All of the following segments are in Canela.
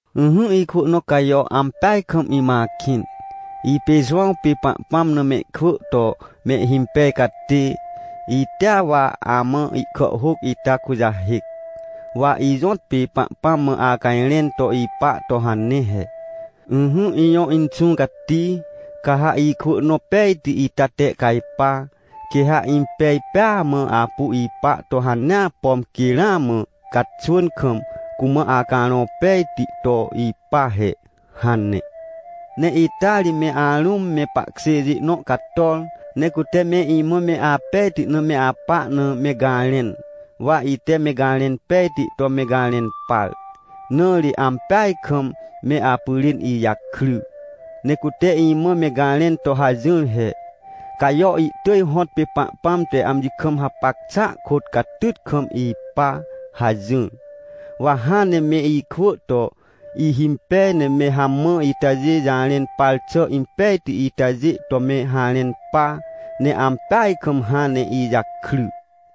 Ỹhỹ ikwỳ nõ Cajo, ampeaj kam imã akĩn. Ipê Jowãw pê Pahpãm na mehkwỳ to mehhimpej catê, itea wa amã ihkàhhôc ita kujahêc. Wa ijõtpê Pahpãm mã acajrẽn to ipa to hane he: — Ỹhỹ, ijõ Inxũ Cati, ca ha ikwỳ nõ pejti ita tehcajpa, quê ha impej pêa mã apu ipa to hanea, pom quê ramã caxwỳn kam cumã Acarõ Pejti to ipa he — hane. Ne ita ri me arũm me pahkjêjê nõ cator, ne cute me imã me apejti na me apa na, me garẽn. Wa ite me garẽn pejti to me garẽn par, na ri ampeaj kam me apyrên ijakry. Ne cute imã me garẽn to hajỹr he: — Cajo ihtỳj hõtpê Pahpãm te amji kam hapac xàa kôt, catyt kam ipa — hajỹr. Wa hãn ne me ikwỳ to ihimpej ne me hamã itajê jarẽn par xà impejti itajê to me harẽn pa, ne ampeaj kam hãn ne ijakry.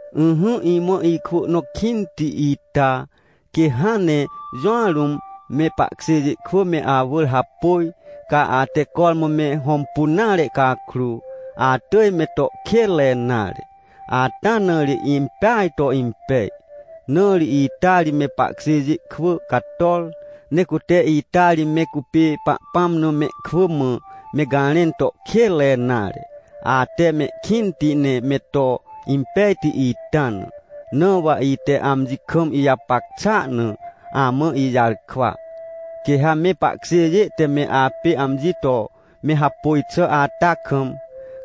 Ỹhỹ imã ikwỳ nõ kĩnti ita, quê hãn ne jũa rũm me pahkjêjê kwỳ me awỳr hapôj, ca ate cormã me hõmpun nare cakrô, atỳj me to kênre nare. Ata na ri impeaj to impej. Na ri ita ri me pahkjêjê kwỳ cator, ne cute ita ri me cupê Pahpãm na mehkwỳ mã me garẽn to kênre nare, ate mehkĩnti ne me to impejti ita na. Na wa ite amji kam ijapac xàa na amã ijarkwa. Quê ha me pahkjêjê te me apê amji to me hapôj xà ata kam,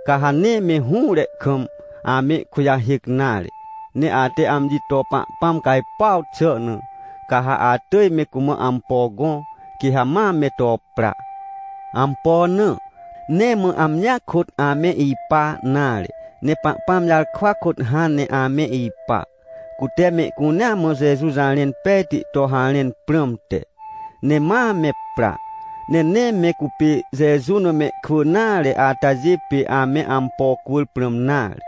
ca ha nee me hũre kam amehkujahêc nare. Ne ate amji to Pahpãm cajpuaw xà na, ca ha atỳj me cumã ampo gõ, quê ha ma me to pra. Ampo na? Nee mã amjia kôt ame ipa nare, ne Pahpãm jarkwa kôt hãn ne ame ipa, cute mehcunea mã Jeju jarẽn pejti to harẽn prãmte. Ne ma me pra, ne nee me cupê Jeju na mehkwỳ nare atajê pê ame ampo cwỳr prãm nare.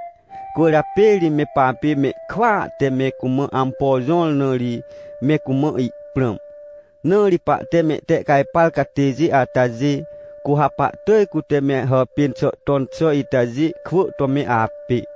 Cwỳrjapê ri me papê mehkwỳa te me cumã ampo jõr na ri, me cumã ihprãm. Na ri pahte mehtehcajpar catêjê atajê, cu ha pahtỳj, cute me hàpên xà ton xà itajê kwỳ to me apê.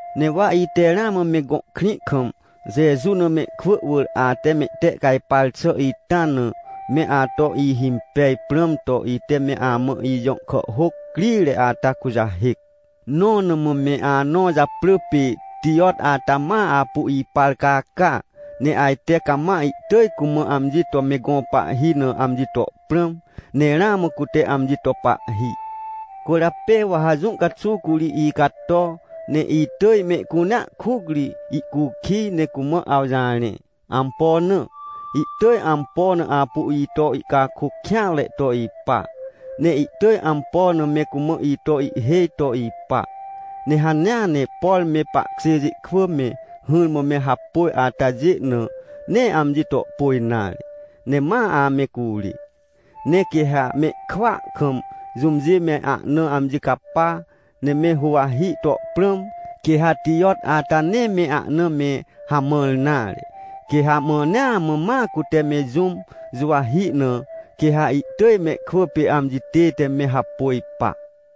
Ne wa ite ramã me gõ krĩ kam, Jeju na mehkwỳ wỳr ate mehtehcajpar xà ita na, me ato ihimpej prãm to, ite me amã ijõ kàhhôc crire ata kujahêc. Nõ na mã me anõ japrỳ pê Tijot ata ma apu ipar caca, ne ajte cama ihtỳj cumã amji to me gõ pahhi na amji to prãm, ne ramã cute amji to pahhi. Cwỳrjapê wa ha jũ caxuw curi icato, ne itỳj mehcunea kuc ri ihcukij ne cumã awjarẽ. Ampo na? Ihtỳj ampo na apu ito ihcakôc kêanre to ipa, ne ihtỳj ampo na me cumã ito ihhêj to ipa. Ne hanea ne, por me pahkjêjê kwỳ me hỹrmã me hapôj atajê na, nee amji to pôj nare, ne ma ame curê. Ne quê ha mehkwỳa kam jũmjê me ahna amji capa ne me huwahi to prãm, quê ha Tijot ata nee me ahna me hamãr nare. Quê ha mãnea mã ma cute me jũm juwahi na, quê ha ihtỳj mehkwỳ pê amji tête me hapôj pa.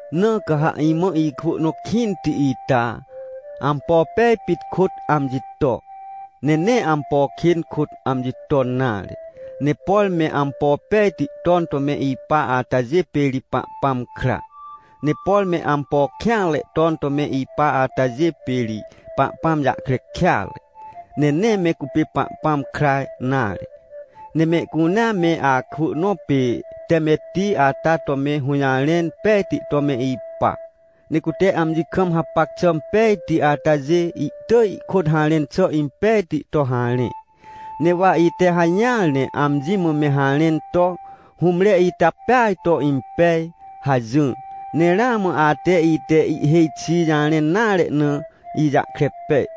Na ca ha imã ikwỳ nõ kĩnti ita, ampo pej pit kôt amji to, ne nee ampo kên kôt amji ton nare. Ne por me ampo pejti ton to me ipa atajê pê ri Pahpãm kra, ne por me ampo kêanre ton to me ipa atajê pê ri Pahpãm jahkre kêatre, ne nee me cupê Pahpãm kra nare. Ne mehcunea me akwỳ nõ pê Temetti ata to me hũjarẽn pejti to me ipa. Ne cute amji kam hapac xà pejti atajê, ihtỳj ihkôt harẽn xà impejti to harẽ. Ne wa ite hajỹar ne amji mã me harẽn to: — Hũmre ita peaj to impej — hajỹr. Ne ramã ate, ite ihêj xi jarẽn nare na, ijahkre pej.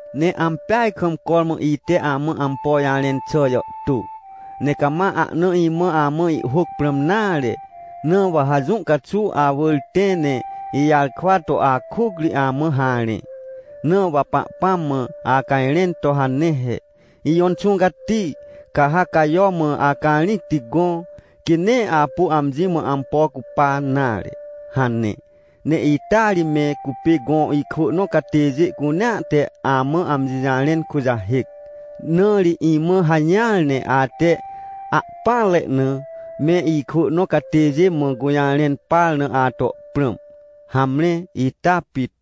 Ne ampeaj kam cormã ite amã ampo jarẽn xà jàhtô, ne cama ahna imã amã ihhôc prãm nare. Na wa ha jũ caxuw awỳr tẽ, ne ijarkwa to akuc ri amã harẽ. Na wa Pahpãm mã acajrẽn to hane he: — Ijõ Inxũ Cati, ca ha Cajo mã acarĩcti gõ, quê nee apu amji mã ampo cupa nare — hane. Ne ita ri me cupê gõ ikwỳ nõ catêjê cunea te amã amji jarẽn kujahêc. Na ri imã hajỹar, ne ate ahpỹanre na me ikwỳ nõ catêjê mã gũjarẽn par na ato prãm. Hamre, ita pit.